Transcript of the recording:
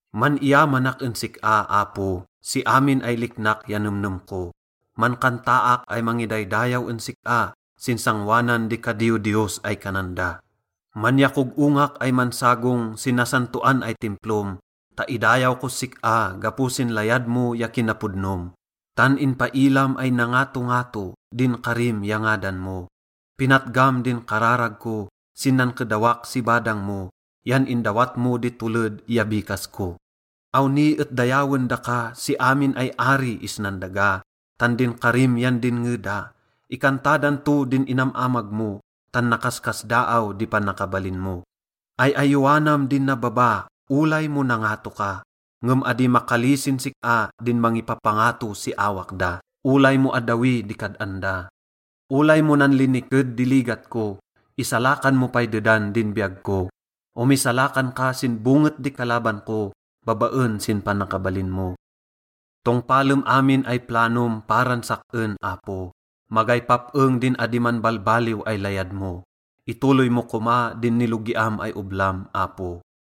Man-iyamanak en sik-a, Apo, si amin ay liknak ya nemnem ko. Mankantaak ay mangidaydayaw en sik-a sin sangoanan di “kadiyodiyos” ay kanan da. Manyakog-ongak ay mansagong sin nasantoan ay Timplom ta idayaw kos sik-a gapo sin layad mo ya kinapodnom, tan inpailam ay nangatongato din karim ya ngadan mo. Pinatgam din kararag ko sin nankedawak si badang mo yan indawat mo di toled ya bikas ko. Awni et dayawen daka si amin ay ari isnan daga, tan din karim yan dinnge da. Ikanta dan to din inam-amag mo, tan nakaskasdaaw di panakabalin mo. Ay-ayowanam din nababa, olay mo nangato ka, ngem adi makalisin sik-a din mangipapangato si awak da, olay mo addawi di kad-an da. Olay mo nanliniked di ligat ko, isalakan mo pay dedan din biyag ko. Omisalakan ka sin bonget di kalaban ko babaen sin panakabalin mo. Tongpalem amin ay planom paran sak-en, Apo, magay pap-eng din adi manbalbaliw ay layad mo, itoloy mo koma din nilogiam ay oblam, Apo.